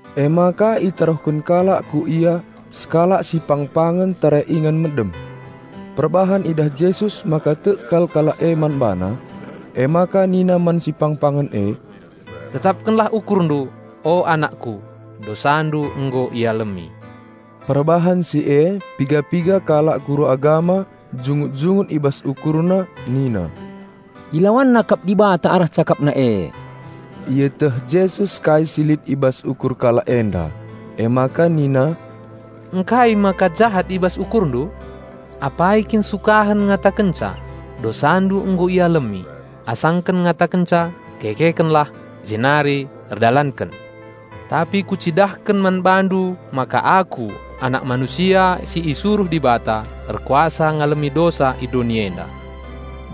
I je itaruhken kalak man BaNa sekalak si pang-pangen tare ingan medem. Perbahan idah Jesus maka tek kal kalak e man BaNa, emaka Nina man si pang-pangen e, "Tetapkenlah ukurndu, o anakKu! Dosandu nggo ialemi." Perbahan si e piga-piga kalak guru agama jungut-jungut i bas ukurna nina, "IlawanNa kap Dibata arah CakapNa e." Ieteh Jesus kai si lit i bas ukur kalak enda, emaka nina, "Ngkai maka jahat i bas ukurndu? Apai kin sukahen ngatakenca, 'Dosandu nggo ialemi,' asangken ngatakenca, 'Kekekenlah, jenari erdalanken!' Tapi Kucidahken man bandu maka Aku, Anak Manusia si isuruh Dibata erkuasa ngalemi dosa i doni enda."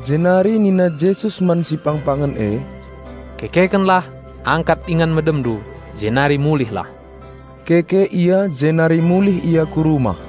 Jenari nina Jesus man si pang-pangen e, "Kekekenlah angkat ingan medemndu, jenari mulihlah!" Keke ia jenari mulih ia ku rumah.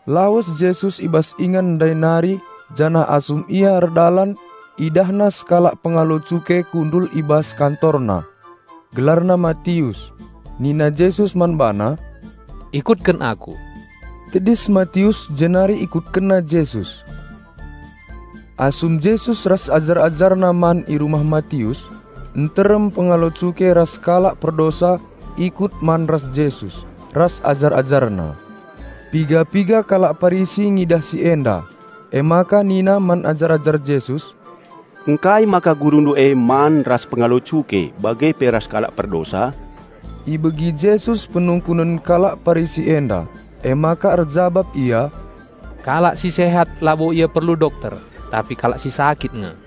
Lawes Jesus i bas ingan ndai nari janah asum Ia erdalan IdahNa sekalak pengalo cuke kundul i bas kantorna. Gelarna Matius. Nina Jesus man bana, "Ikutken Aku." Tedis Matius jenari ikutkenna Jesus. Asum Jesus ras ajar-AjarNa man i rumah Matius, nterem pengalo cuke ras kalak perdosa ikut man ras Jesus ras ajar-AjarNa. Piga-piga kalak Parisi ngidah si enda. Emaka nina man ajar-ajar Jesus, "Ngkai maka Gurundu e man ras pengalo cuke bage pe ras kalak perdosa?" Ibegi Jesus penungkunen kalak Parisi enda, emaka erjabap Ia, "Kalak si sehat labo ia perlu dokter, tapi kalak si sakit nge.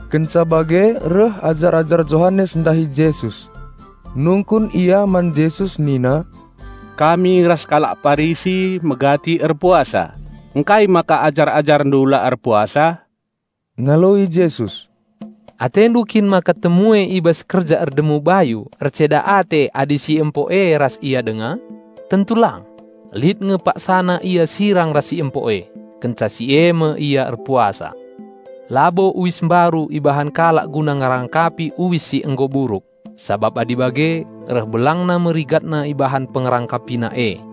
Kenca bage reh ajar-ajar Johanes ndahi Jesus. Nungkun ia man Jesus nina, "Ngkai maka ajar-AjarNdu la erpuasa? Kami ras kalak Parisi megati nge erpuasa." Ngaloi Jesus, "Atendu kin maka temue i bas kerja erdemu bayu erceda ate adi si empo e ras ia denga? Tentu lang! Lit nge paksana ia sirang ras si empo e. Kenca si e me ia erpuasa. Labo uis mbaru ibahan kalak guna ngerangkapi uis si nggo buruk. Sabap adi bage, reh belangna me rigatna ibahan pengerangkapina e.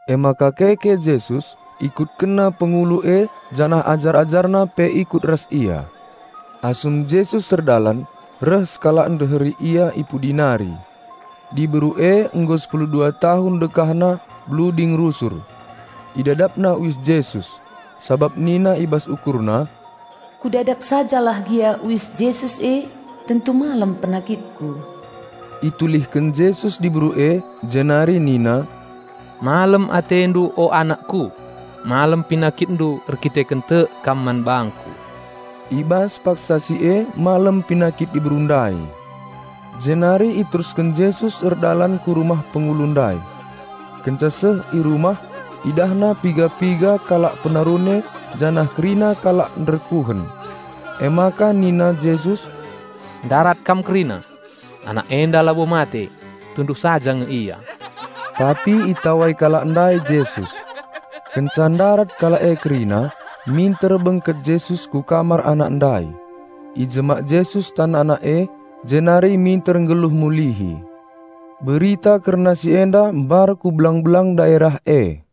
Emaka keke Jesus, IkutkenNa pengulu e janah ajar-AjarNa pe ikut ras Ia. Asum Jesus erdalan, reh sekalak ndeheri Ia i pudi nari. Diberu e nggo sepulu dua tahun dekahna bluding rusur. Idadapna uis Jesus, sabap nina i bas ukurna, "Kudadap saja lah gia uis Jesus e, tentu malem penakitku." Itulihken Jesus diberu e, jenari nina, "Malem atendu, o anakKu! Malem penakitndu erkiteken tek kam man bangKu." I bas paksa si e malem penakit diberu ndai. Jenari iterusken Jesus erdalan ku rumah pengulu ndai. Kenca seh i rumah, IdahNa piga-piga kalak narune ras kerina kalak nderkuhen. Emaka nina Jesus "Ndarat kam kerina! Anak enda labo mate, tunduh saja nge ia!" Nguncim kalak si nterem man Jesus. Kenca ndarat kalak e kerina, minter bengket Jesus ku kamar anak ndai. Ijemak Jesus tan anak e jenari minter nggeluh mulihi. Berita kerna si enda mbar ku belang-belang daerah e.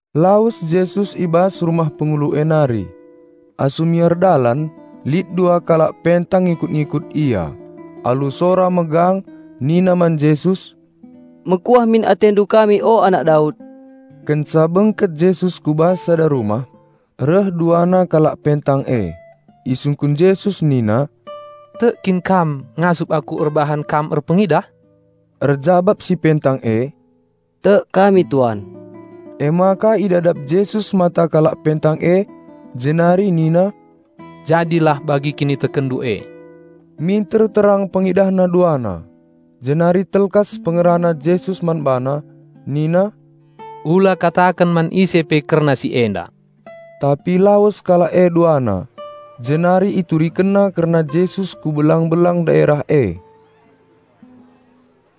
Lawes Jesus i bas rumah pengulu e nari. Asum ia erdalan lit dua kalak pentang ngikut-ngikut Ia. Alu sora megang nina man Jesus, "Mekuah min atendu kami, o Anak Daud!" Kenca bengket Jesus ku bas sada rumah, reh duana kalak pentang e. Isungkun Jesus nina, "Tek kin kam ngasup Aku erbahan kam erpengidah?" Erjabap si pentang e, "Tek kami Tuan!" Emaka idadap Jesus mata kalak pentang e jenari nina, "Jadilah bagi kinitekenndu e." Minter terang pengidahna duana. Jenari alu telkas ngerana Jesus man bana, "ola kataken man ise pe kerna si enda!" Tapi lawes kalak e duana, jenari iturikenna kerna Jesus ku belang-belang daerah e.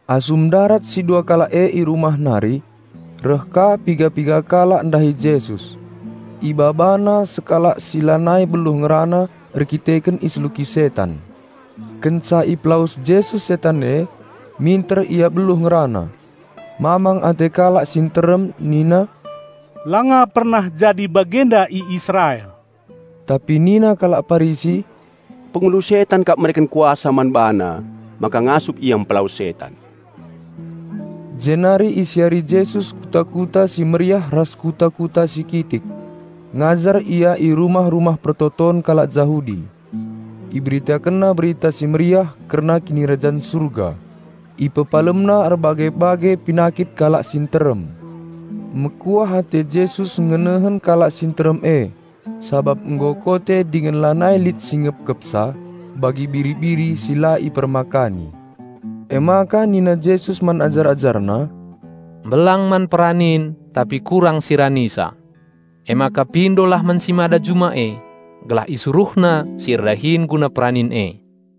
Asum ndarat si dua kalak e i rumah nari, reh ka piga-piga kalak ndahi Jesus. Ibabana sekalak si lanai beluh ngerana erkiteken iseluki setan. Kenca ipelawes Jesus setan e, minter ia beluh ngerana. Mamang ate kalak si nterem nina, "Langa pernah jadi bagenda i Israel!" Tapi nina kalak Parisi, "Pengulu setan kap mereken kuasa man BaNa maka ngasup Ia mpelawes setan." Jenari isiari Jesus kuta-kuta si meriah ras kuta-kuta si kitik. Ngajar Ia i rumah-rumah persembahen kalak Jahudi. IberitakenNa Berita Si Mehuli kerna Kinirajan Surga. IpepalemNa erbage-bage penakit kalak si nterem. Mekuah ate Jesus ngenehen kalak si nterem e, sabap nggo kote dingen lanai lit si ngepkepsa, bagi biri-biri si la ipermakani. Emaka nina Jesus man ajar-AjarNa, "Mbelang man peranin, tapi kurang si ranisa. Emaka pindolah man si Mada juma e, gelah IsuruhNa si erdahin guna peranin e."